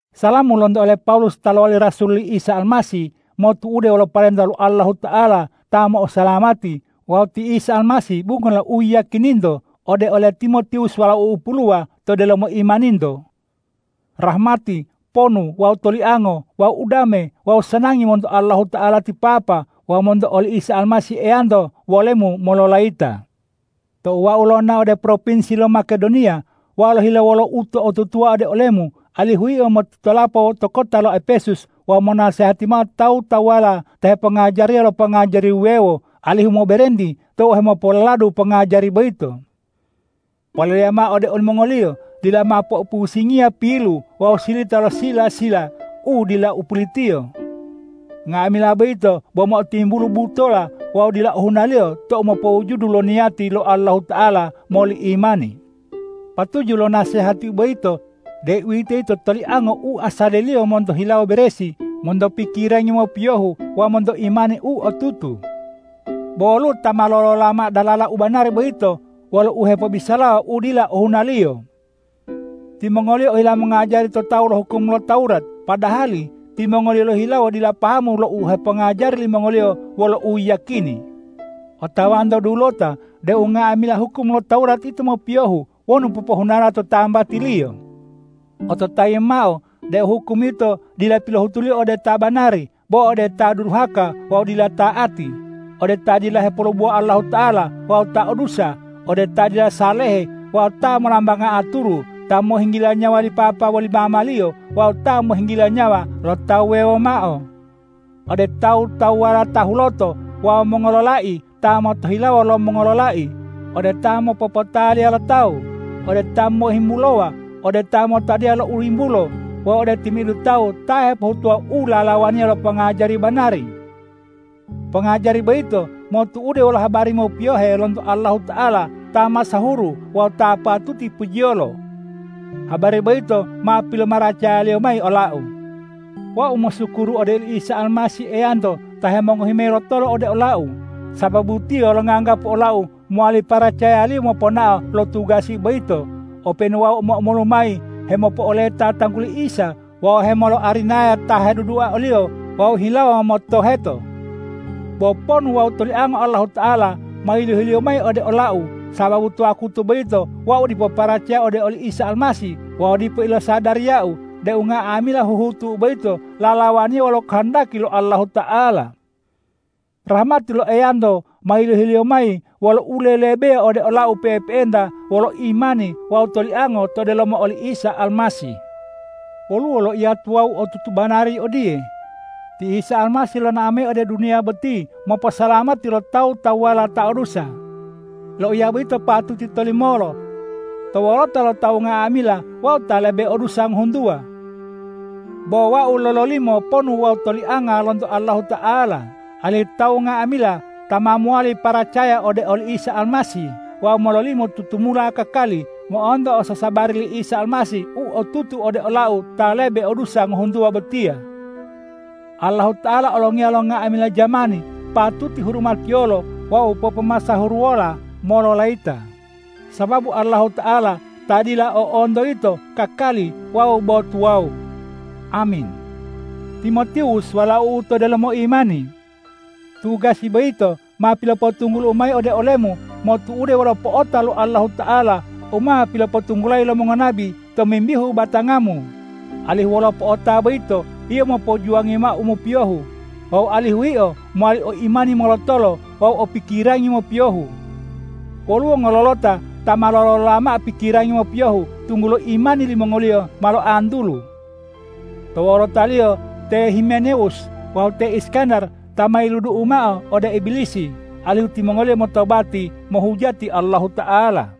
Salamu lonto ole Pawulus ta lowali rasul li Isa Almasih motu'ude wolo parenta lo Allahuta'ala ta mo'osalamati wawu ti Isa Almasih bungo lo uyiyakininto ode ole Timotiwus walau'u puluwa to delomo imaninto. Rahmati, ponu wawu toliango wawu udame wawu sanangi monto Allahuta'ala ti Papa wawu monto oli Isa Almasih Eyanto wolemu mololayita. Tou wau lonao ode propinsi lo Makedoniya, wau lohile wolo uto'otutuwa ode olemu, alihu yio motitolapo to kota lo Epesus wawu monasehati mao tawu-tawuwala ta hepongajariya lo pongajari wuwewo, alihu moberenti tou hemopololadu pongajari boyito. Poleleya mao ode olimongoliyo: Dila mao poipusingiya pilu wawu silita lo sila-sila u dila o pulitiyo. Nga'amila boyito bo mo'otimbulu butola wawu dila ohunaliyo tou mopowujudu lo niyati lo Allahuta'ala moli imani. Patuju lo nasehati boyito, deuwitoyito toliango u asaliliyo monto hilawo beresi, monto pikirangi mopiyohu wawu monto imani u otutu. Bo woluwo ta ma lolola mao dalala u banari boyito wolo uhepobisalawa u dila ohunaliyo. Timongoliyo ohila mongajari to tawu lo hukum lo Tawurat, padahali timongoliyo lohihilawo dila pahamu lo u hepongajari limongoliyo wolo u yiyakini. Otawanto dulota deu nga'amila hukum lo Tawurat yito mopiyohu wonu popohunala to tambatiliyo. Ototayimu mao deu hukum yito dila pilohutuliyo ode ta banari, bo ode ta duruhaka wawu dila ta'ati, ode ta dila hepolubowa Allahuta'ala wawu ta o dusa, ode ta dila salehe wawu ta mollambanga aturu, ta mohinggila nyawa li papa woli mamaliyo wawu ta mohinggila nyawa lo ta wuwewo mao, ode tawu-tawuwala ta huloto wawu mongololai ta motohilawo lo mongololai, ode ta mopopotaliya lo tawu, ode ta mohimbulowa, ode ta motadiya lo u yimbulo wawu ode timi'idu tawu ta hepohutuwa u lalawaniya lo pongajari banari. Pongajari boyito motu'ude wolo habari mopiyohe lonto Allahuta'ala ta masahuru wawu ta patuti pujiyolo. Habari boyito ma pilomaracaya-Liyo mayi olau. Wau mosukuru ode oli Isa Almasih Eyanto ta hemongohi mayi lotolo ode olau, sababu Tiyo longanggapu olau mowali paracaya-Liyo moponao lo tugasi boyito, openu wau omo-omolu mayi hemopo'oleta tangguli Isa wawu hemoloarinayawa ta hedudua o-Liyo wawu o hilawo motoheto. Bo ponu wawu toliango Allahuta'ala ma yilohi-Liyo mayi ode olau, sababu to wakutu boyito wau dipo paracaya ode oli Isa Almasih wawu dipo ilosadariyau deu nga'amila huhutu'u boyito lalawaniya wolo kohondaki lo Allahuta'ala. Rahmati lo Eyanto ma yilohi-Liyo mayi wolo ulelebeya ode olau pe'epe'enta wolo imani wawu toliango to delomo oli Isa Almasih. Woluwo loiya tuwawu u otutu banari odiye,”Ti Isa Almasih lonao mayi ode duniya boti moposalamati lo tawu-tawuwala ta o dusa.” Loiya boyito patuti tolimolo. To wolota lo tawu nga'amila wau ta lebe o dusa ngohuntuwa. Bo wau lololimo ponu wawu tolianga lonto Allahuta'ala, alihu tawu nga'amila ta ma mowali paracaya ode oli Isa Almasih wawu mololimo tutumula kakali, mo'onto ososabari li Isa Almasih u otutu ode olau ta lebe o dusa ngohuntuwa botiya. Allahuta'ala Olongiya lo nga'amila jamani patuti hurumatiyolo wawu popomasahuruwola mololayita, sababu Allahuta'ala ta dila o'onto yito, kakali wawu bo tuwawu! Amin. Timotiwus walau'u to delomo imani! Tugasi boyito ma pilopotunggulu'u mayi ode olemu motu'ude wolo po'ota lo Allahuta'ala u ma pilopotunggulayi lo mongonabi tomimbihu batangamu, alihu wolo po'ota boyito yio mopojuwangi mao u mopiyohu wawu alihu yio mowali o imani molotolo wawu o pikirangi mopiyohu. Woluwo ngololota ta ma lolola mao pikirangi mopiyohu, tunggulo imani limongoliyo ma loantulu. To wolotaliyo te Himenewus wawu te Iskandar ta ma yiludu'u mao ode Ibilisi, alihu timongoliyo motobati mohujati Allahuta'ala.